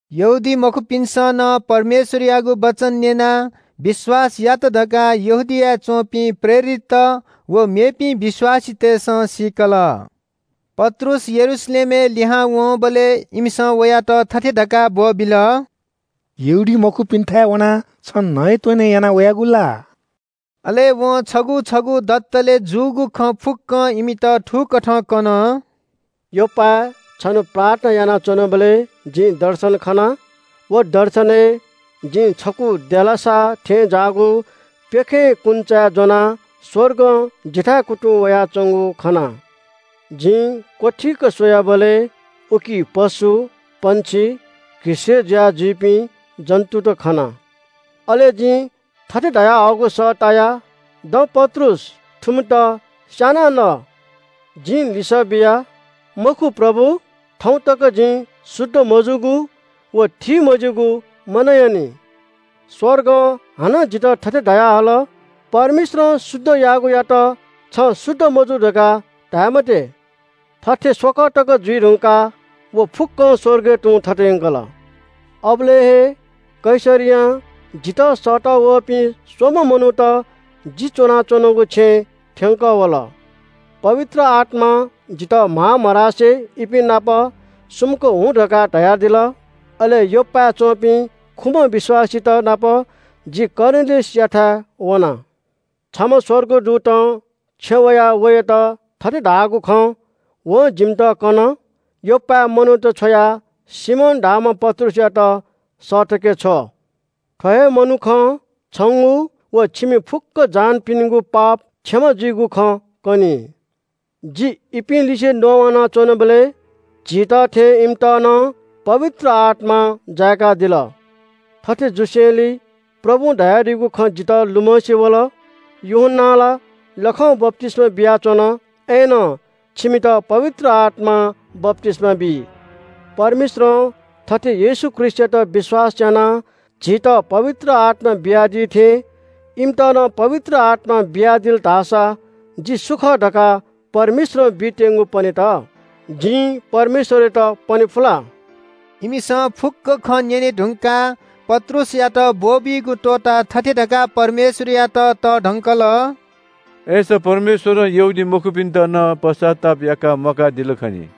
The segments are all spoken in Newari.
यहूदीमखुपिन्‍सं नं परमेश्‍वरयागु वचन न्‍यनाः विश्‍वास यात धकाः यहूदियाय् च्‍वंपिं प्रेरितत व मेपिं विश्‍वासीतय्‌सं सीकल। पत्रुस यरूशलेमय् लिहां वंबलय् इमिसं वयात थथे धकाः ब्‍वःबिल – “यहूदीमखुपिन्‍थाय् वनाः छं नयेत्‍वने याना वयागु ला?” अले वं छगू छगू दतले जूगु खँ फुक्‍कं इमित थुकथं कन – “योप्‍पाय् छन्‍हु प्रार्थना यानाच्‍वनाबलय् जिं दर्शन खना। व दर्शनय् जिं छकू देलासा थें ज्‍याःगु प्‍यखें कुन्‍चाय् ज्‍वनाः स्‍वर्गं जिथाय् कुतुं वयाच्‍वंगु खना। जिं क्‍वथीक स्‍वयाबलय् उकी पशु, पक्षी, घिसय्‌ जुया जुइपिं जन्‍तुत खना। अले जिं थथे धयाहःगु सः ताया – ‘दँ पत्रुस, थुमित स्‍यानाः न।’ “जिं लिसः बिया – ‘मखु प्रभु, थौं तक जिं शुद्ध मजूगु व थीमज्‍यूगु मनयानि।’ “स्‍वर्गं हानं जितः थथे धयाहल – ‘परमेश्‍वरं शुद्ध याःगुयात छं शुद्ध मजू धकाः धाये मते।’ थथे स्‍वकः तक जुइ धुंकाः व फुक्‍कं स्‍वर्गय् तुं थत यंकल। “अबलय् हे कैसरियां जितः सःतःवःपिं स्‍वम्‍ह मनूत जि च्‍वनाच्‍वनागु छेँय् थ्‍यंकः वल। पवित्र आत्‍मां जितः म्‍हां मधासे इपिं नाप सुमुक हुँ धकाः धयादिल। अले योप्‍पाय् च्‍वंपिं खुम्‍ह विश्‍वासीतनाप जि कर्नेलियसयाथाय् वना। छम्‍ह स्‍वर्गदूतं छेँय् वयाः वयात थथे धाःगु खँ वं जिमित कन – ‘योप्‍पाय् मनूत छ्वयाः सिमोन धाःम्‍ह पत्रुसयात सःतके छ्व। थ्‍व हे मनुखं छंगु व छिमि फुक्‍क जहानपिनिगु पाप क्षमा जुइगु खँ कनी।’ “जि इपिं लिसे नवाना च्‍वनाबलय् झीत थें इमित नं पवित्र आत्‍मां जाय्‌कादिल। थथे जुसेंलि प्रभुं धयादीगु खँ जितः लुमंसे वल – ‘यूहन्‍नां ला लखं बप्‍तिस्‍मा बियाच्‍वन, अय्‌नं छिमित पवित्र आत्‍मां बप्‍तिस्‍मा बी।’ परमेश्‍वरं थथे येशू ख्रीष्‍टयात विश्‍वास यानाः झीत पवित्र आत्‍मा बियादी थें इमित नं पवित्र आत्‍मा बियादिल धाःसा जि सु खः धकाः परमेश्‍वरं बीत्‍यंगु पनेत, जिं परमेश्‍वरयात पने फु ला?” इमिसं फुक्‍क खँ न्‍यने धुंकाः पत्रुसयात ब्‍वःबीगु त्‍वःताः थथे धकाः परमेश्‍वरयात तःधंकल – “अय्‌सा परमेश्‍वरं यहूदीमखुपिन्‍त नं पश्‍चाताप याकाः म्‍वाकादिल खनी।”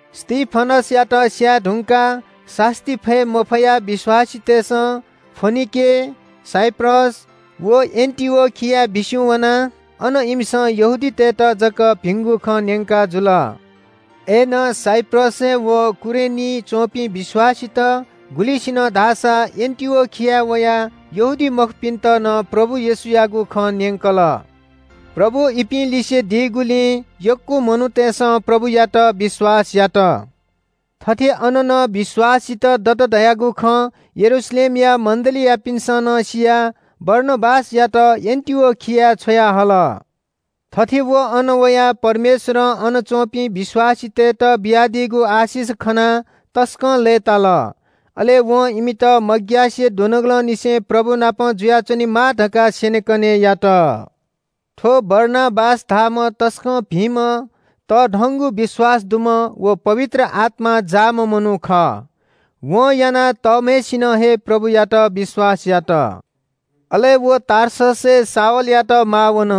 स्‍तिफनसयात स्‍यायेधुंकाः सास्‍ती फये मफयाः विश्‍वासीतय्‌सं फोनिके, साइप्रस व एन्‍टिओखियाय् बिस्‍युं वनाः अन इमिसं यहूदीतय्‌त जक भिंगु खँ न्‍यंकाजुल। अय्‌नं साइप्रसय् व कुरेनीइ च्‍वंपिं विश्‍वासीत गुलिसिनं धाःसा एन्‍टिओखियाय् वयाः यहूदीमखुपिन्‍त नं प्रभु येशूयागु खँ न्‍यंकल। प्रभु इपिं लिसे दीगुलिं यक्‍व मनूतय्‌सं प्रभुयात विश्‍वास यात। थथे अन नं विश्‍वासीत दत धयागु खँ यरूशलेमया मण्‍डलीयापिन्‍सं सियाः बारनाबासयात एन्‍टिओखियाय् छ्वयाहल। थथे व अन वयाः परमेश्‍वरं अन च्‍वंपिं विश्‍वासीतय्‌त बियादीगु आशिष खनाः तसकं लय्‌ताल। अले वं इमित मग्‍यासे दुनुगलंनिसें प्रभु नाप जुयाच्‍वनेमाः धकाः स्‍यनेकने यात। थ्‍व बारनाबास धाःम्‍ह तसकं भिंम्‍ह तःधंगु विश्‍वास दुम्‍ह व पवित्र आत्‍मां जाःम्‍ह मनू खः। वं यानाः तःम्‍हय्‌सिनं हे प्रभुयात विश्‍वास यात। अले व टार्ससय् शाऊलयात माः वन।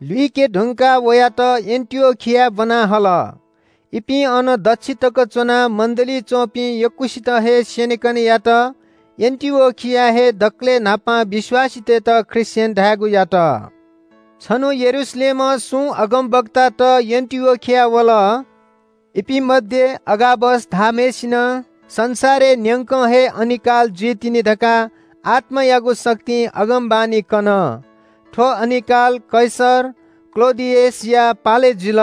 लुइके धुंकाः वयात एन्‍टिओखियाय् ब्‍वना हल। इपिं अन दच्‍छि तक च्‍वनाः मण्‍डलीइ च्‍वंपिं यक्‍वसित हे स्‍यनेकने यात। एन्‍टिओखियाय् हे दकलय् न्‍हापां विश्‍वासीतय्‌त ख्रीष्‍टियन धायेगु यात। छन्‍हु यरूशलेमं सुं अगमवक्तात एन्‍टिओखियाय् वल। इपिं मध्‍ये अगाबस धाःम्‍हय्‌सिनं संसारय् न्‍यंक हे अनिकाल जुइतिनि धकाः आत्‍मायागु शक्तिं अगमवाणी कन। थ्‍व अनिकाल कैसर क्‍लौडियसया पालय् जुल।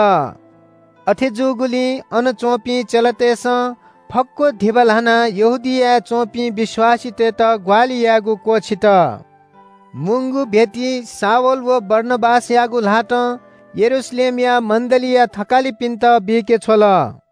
अथे जूगुलिं अन च्‍वंपिं चेलातय्‌सं फक्‍व धिबा ल्‍हानाः यहूदियाय् च्‍वंपिं विश्‍वासीतय्‌त ग्‍वाहालि यायेगु क्‍वःछित। मुंगु भेटी शाऊल व बारनाबासयागु ल्‍हातं यरूशलेमया मण्‍डलीया थकालिपिन्‍त बीके छ्वल।